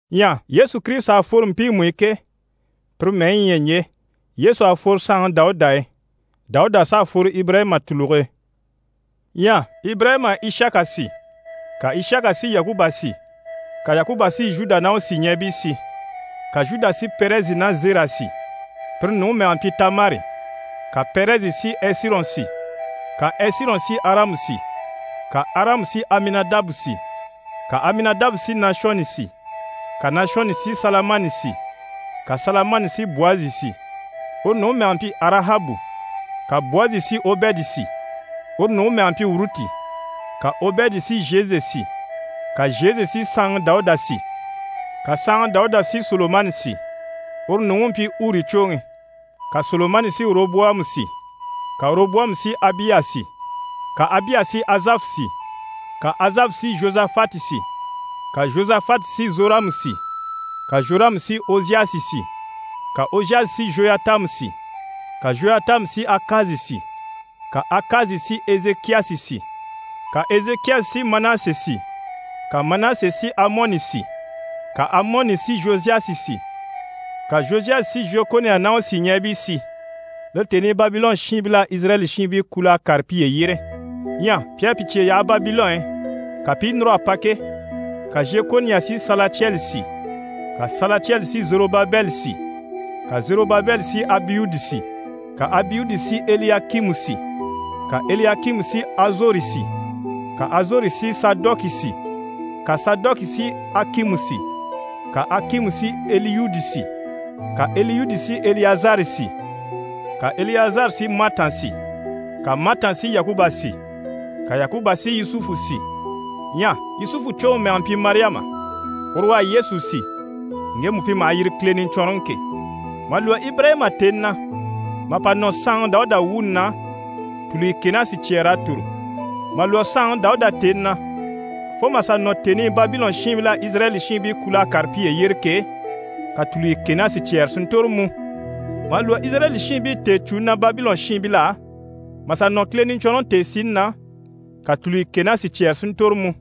Ɲyɛ Yesu Kirisita à fworo mpiimu i ke, pire mɛyi yi ɲyɛ ɲje: Yesu à fworo saanŋi Dawuda e, Dawuda s'à fworo Ibirayima tùluge e. Ɲyɛ Ibirayima à Ishaka si, ka Ishaka si Yakuba si, ka Yakuba si Zhuda ná u sìɲɛɛbii si, Ka Zhuda si Pɛrɛzi ná Zera si. (Pire nuŋi mɛge mpyi Tamari.) Ka Pɛrɛzi si Ɛsirɔn si, ka Ɛsirɔn si Aramu si, ka Aramu si Aminadabu si, ka Aminadabu si Nashɔni si, ka Nashɔni si Salamani si, ka Salamani si Bwazi si. (Uru nuŋi mɛge mpyi Arahabu.) Ka Bwazi si Obɛdi si. (Uru nuŋi mɛge mpyi Uruti.) Ka Obɛdi si Zhese si, ka Zhese si saanŋi Dawuda si. Ka saanŋi Dawuda si Solomani si. (Uru nuŋi u mpyi Uri cwoŋi.) Ka Solomani si Oroboyamu si, ka Oroboyamu si Abiya si, ka Abiya si Azafu si. Ka Azafu si Zhozafati si, ka Zhozafati si Zhoramu si, ka Zhoramu si Oziyasi si. Ka Oziyasi si Zhoyatamu si, ka Zhoyatamu si Akazi si, ka Akazi si Ezekiyasi si, ka Ezekiyasi si Manase si, ka Manase si Amɔni si, ka Amɔni si Zhoziyasi si, ka Zhoziyasi si Zhekoniya ná u sìɲɛɛbii si. (Lire tèni i Babilɔn shiinbil'à Izirayɛli shiinbii kul'a kàre piye yyére.) Ɲyɛ pi à pi cye yaha Babilɔn i, ka pi i núr'a pa ke, ka Zhekoniya si Salatiyɛli si, ka Salatiyɛli si Zorobabɛli si, ka Zorobabɛli si Abiyudi si, ka Abiyudi si Eliyakimu si, ka Eliyakimu si Azori si, ka Azori si Sadɔki si, ka Sadɔki si Akimu si, ka Akimu si Eliyudi si, ka Eliyudi si Eliyazari si, ka Eliyazari si Matan si, ka Matan si Yakuba si, ka Yakuba si Yusufu si. Ɲyɛ Yusufu cwoŋi mɛge mpyi Mariyama. Uru u à Yesu si, ŋgemu pi maha yiri Kile Niɲcwɔnrɔŋi ke. Mà lwɔ́ Ibirayima tèni na mà pa nɔ saanŋi Dawuda wuuni na, tulyeye kɛ ná sicyɛɛr'à tòro. Mà lwɔ́ saanŋi Dawuda tèni na fo mà sà nɔ tèni i Babilɔn shiinbil'à Izirayɛli shiinbii kul'a kàre piye yyére ke, ka tulyeye kɛ ná sicyɛɛre si ntòro mú. Mà lwɔ́ Izirayɛli shiinbii tèecûni na Babilɔn shiinbil'á, mà sà nɔ Kile Niɲcwɔnrɔŋi tèesini na, ka tulyeye kɛ ná sicyɛɛre si ntòro mú.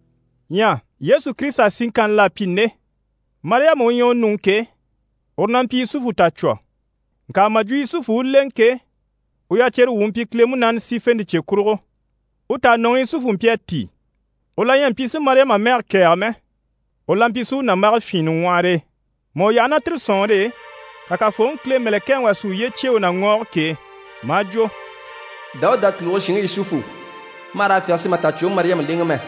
Ɲyɛ Yesu Kirisita siŋkanni l'à pyi nde: Mariyama u ɲyɛ u nuŋi ke, uru na mpyi Yusufu tàcwo. Ŋka mà jwo Yusufu u u lèŋɛ ke, u yacere wu u mpyi Kile Munaani sífente cye kurugo. U tànɔŋi Yusufu mpyi a tíi, u la ɲyɛ a mpyi si Mariyama mɛge kɛ̀ɛge mɛ. U la mpyi si u nàmbage fyìinnɛ ŋwɔhɔre e. Mà u yaha ná tire sɔ̀nŋɔre e, ka Kafooŋi Kile mɛ̀lɛkɛŋi wà si uye cyêe u na ŋɔɔge k'e, maa jwo: «Dawuda tùluge shinŋi Yusufu, ma hà raa fyáge si ma tàcwoŋi Mariyama lèŋɛ mɛ,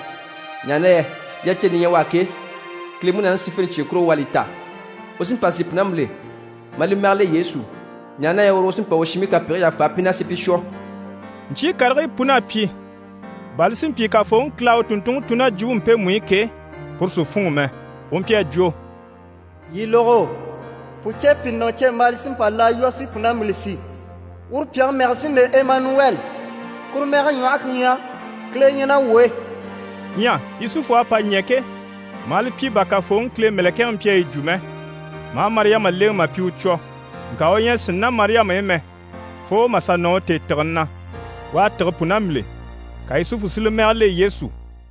ɲaha na yɛ yaceni li ɲyɛ u á ke, Kile Munaani sífente cye kurugo u à li ta. U sí n‑pa si pùnambile, maa li mɛge le Yesu, ɲaha na yɛ uru u sí n‑pa u shiinbii kapegigii yàfa pi na, si pi shwɔ.» Ɲcyii karigii pun'à pyi bà li si mpyi Kafooŋi Kile à u tùnntunŋi tun ná jwumpe mpemu i ke, puru si fûnŋɔ mɛ. U mpyi a jwo: «Yii lógo, pùcepyinɔcembaala sí n‑pa laa lwɔ́ si pùnambile si, uru pyàŋi mɛge sí n‑le Emanuwɛli» kuru mɛge ɲwɔhe ku ɲyɛ: «Kile ɲyɛ ná wuu e.» Ɲyɛ Yusufu à pa ɲɛ̀ ke, maa li pyi bà Kafooŋi Kile mɛ̀lɛkɛŋi mpyi a yi jwo mɛ, maa Mariyama lèŋɛ mà pyi u cwo. Ŋka u ɲyɛ a sínni ná Mariyama i mɛ, fo mà sà nɔ u tèetigeni na. U à tîge pùnambile, ka Yusufu si li mɛge le Yesu.